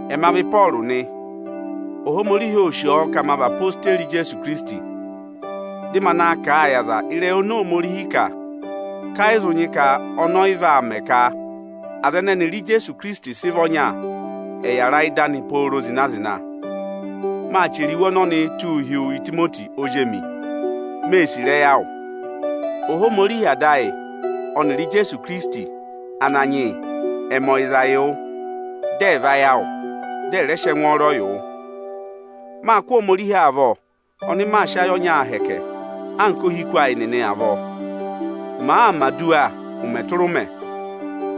Ẹma vị Ịpọọrụ nị. Ohomorihi ô sì ọ ka ma vị odeyi Ijeesu Ikirisiti, dị ma na kà a yị aza ịrẹyị oni Ohomorihi kà, ka ẹ yị zị nyị ka ọnị ọ yị vaa mẹ ka aza ẹnẹ ẹnịrị Ijeesu Ikirisiti sị vị ọnya, ẹ̀ yàra ịdị anị pooro zịna-zịna. Maa chẹrẹ iwe ọnọnịị tụ́ụ hi wu Itimoti ozi emi, mée sì ịrẹyị awụ. Ohomorihi Ada ayị ọnịrị Ijeesu Ikirisiti Ananyị yị ẹ̀ mẹ ọyịza wụ, dị ẹ̀ vayị awụ, dị ẹ̀ rẹ mẹ ẹngwọọrọ yị wụ. Máa kụ́ Ohomorihi avọ, ọnị maa sị ayị ọnyaa hẹkẹ anka ohiku ayị nịnị avọọ. Màaa mẹ̀ aduwa ụmẹ tụra ụmẹ,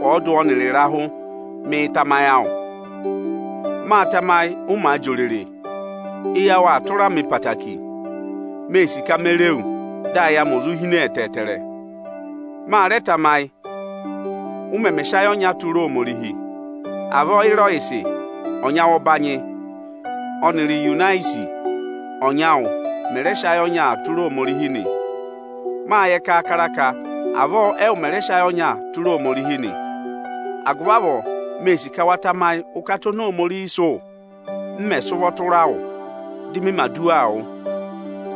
ọọdụ ọnịrị ịrahụ, mịị̄ tamayị awụ. Mâ tamayị ụ maa jị òrèrè. Eyi awụ aa tụra mị ẹtẹẹtẹrẹ; mee sì ka me re wu dị ayị amị ò zụ hine ẹtẹẹtẹrẹ. Ma rẹ tamayị, ụ mẹmẹ sị ayị ọnya tụra Ohomorihi. Avọọ Ịrọyịsị ọnyị awụ ọbanyị ọnịrị Iyunisi ọnyị awụ mẹ̀ rẹ sị ayị ọnya tụra Ohomorihi nị. Mâ yẹ kaakara ka avọọ ẹwụ mẹ̀ rẹ sị ayị ọnya tụra Ohomorihi nị. Agụvị avọọ, mee sì ka wa tamayị ụkata oni Ohomorihi sị wụ, m mẹ̀ sị ụvọ tụra wụ, dị mị mẹ̀ aduwaa wụ.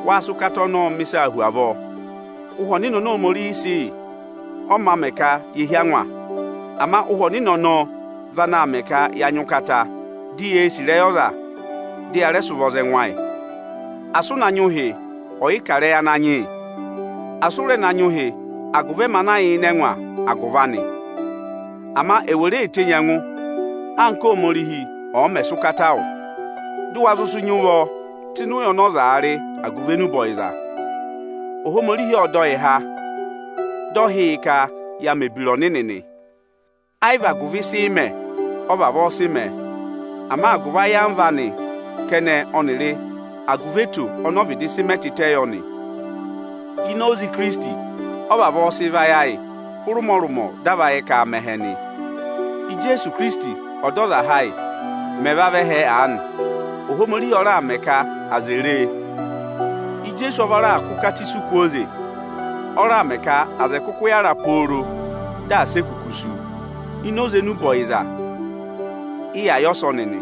Waa sị ụkata ọnọọ mẹ̀ ịsaa hu avọọ. Ụhwẹ Ọnịnị oni Ohomorihi sị yị, ọ mā mẹ ka yee hí angwa. Ama Ụhwẹ Ọnịnị ọnọọ vị anaa mẹ ka yaa nyị ụkata, di yee sì ịrẹyị ọza, dị yaa rẹẹ sị ụvọọ za ẹngụ ayị. Asị ụ na nyị ụhị ọ̀yị kà ịrẹyị Ananyị yị! Asị ụ rẹ na nyị ụhị agụvị ẹmị ana yà ịnị ẹngwa agụvị anị. Ama è wè re tenyi ẹngụ anka Óhomorihi ọ̀ọ mẹ̀ sị ụkata wụ, dị ụ wa nyị ụvọ tụ́ ịnị ụya ọnị ọzaa rị agụvị enube ọyịza. Ohomorihi ọ dọ yị ha, dị ọ hị́ yị ka yaa mẹ̀ ebira ọnịnị nị. Ẹ́ yị vị agụvị ịsị ị mẹ ọ vavọọ sị mẹ; ama agụvị ayamva anị kẹnẹ ọnịrị agụvị eto ọnị ọ vịdị sị mẹ yọ nị. Ini oze Ikirisiti ọ vavọọ sị vayị ayị hụrị ụmọrụmọ dị a va yẹ ka aa mẹ ẹhẹ nị. Ijeesu Ikirisiti Ọdọzaha ayị mẹ̀ vavẹ ẹhẹ aanị, Ohomorihi ọ raà mẹ ka aza è ree. Ijeesu ọ va raà kụ́ ụkata isu kwooze; ọ raà mẹ ka aza ẹ̀ kụkụ yára pooro dị asị e kuku sú. Ini oze enube ọyịza ị ya yẹ ọsọnị nị.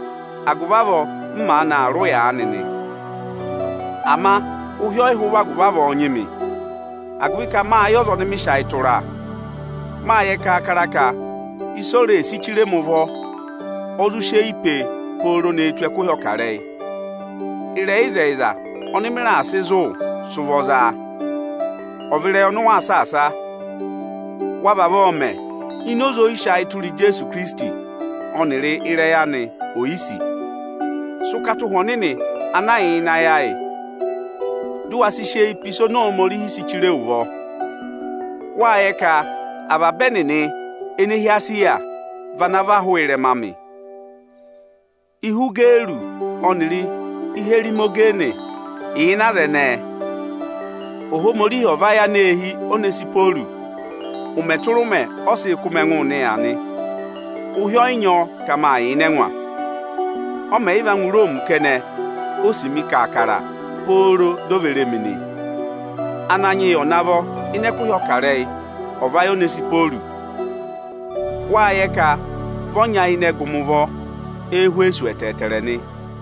Agụvị avọọ m maanị aa rị ụya aanị nị. Ama ụhị ẹ yị hụ agụvị avọọ nyị mị, agụvị ka mâ yẹ ọza ọnị mị sị ayị tụra. Mâ yẹ kaakara ka ịsị o si chire mị ụvọ, o zụ si eyi pee pooro ne tù ẹkụhị ọkarẹyị. Ịrẹyị ịzẹyịza ọnị mị raà sị zụ̀ wụ, sị ụvọ zaa; ọ̀ vị ịrẹyị ọnị ụ waa saasa. Wa vavọọ mẹ ini oze ọ́yị sị ayị tụra Ijeesu Ikirisiti ọnịrị ịrẹyị anị oyisì. Sị ụkata Ụhwẹ Ọnịnị ana yà ịnị ayị ayị, dị ụ wa sị sị eyi pe ịsị Ohomorihi si chire wu ụvọ. Wâ yẹ ka avaba ẹnịnị ene hi Esiya vana và hụụ ịrẹma amị. Ihwigẹlọsị ọnịrị Iherimogene yà ịnị aza ẹnẹẹ. Ohomorihi ọ̀ vayị aneehi Onesihworọsị. Ụmẹ tụra ụmẹ ọ sịị kụ́ mị ẹngụụ nịya nị. Ụhị ọyị nyị ọ ka mị yà ịnị ẹngwa Ọ màa yị va ngụ Iroomi kẹnẹ ô sì mi avaba aha, di o ve re mi nị. Ananyị yị ọ̀ navọ ịnị ẹkụhị ọkarẹyị, ọ̀ vayị Onesihworọsị oo! Wâ yẹ ka vị ọ nyayịnẹ gụ mị ụvọ Ẹ́hwẹsọsị ẹtẹẹtẹrẹ nị.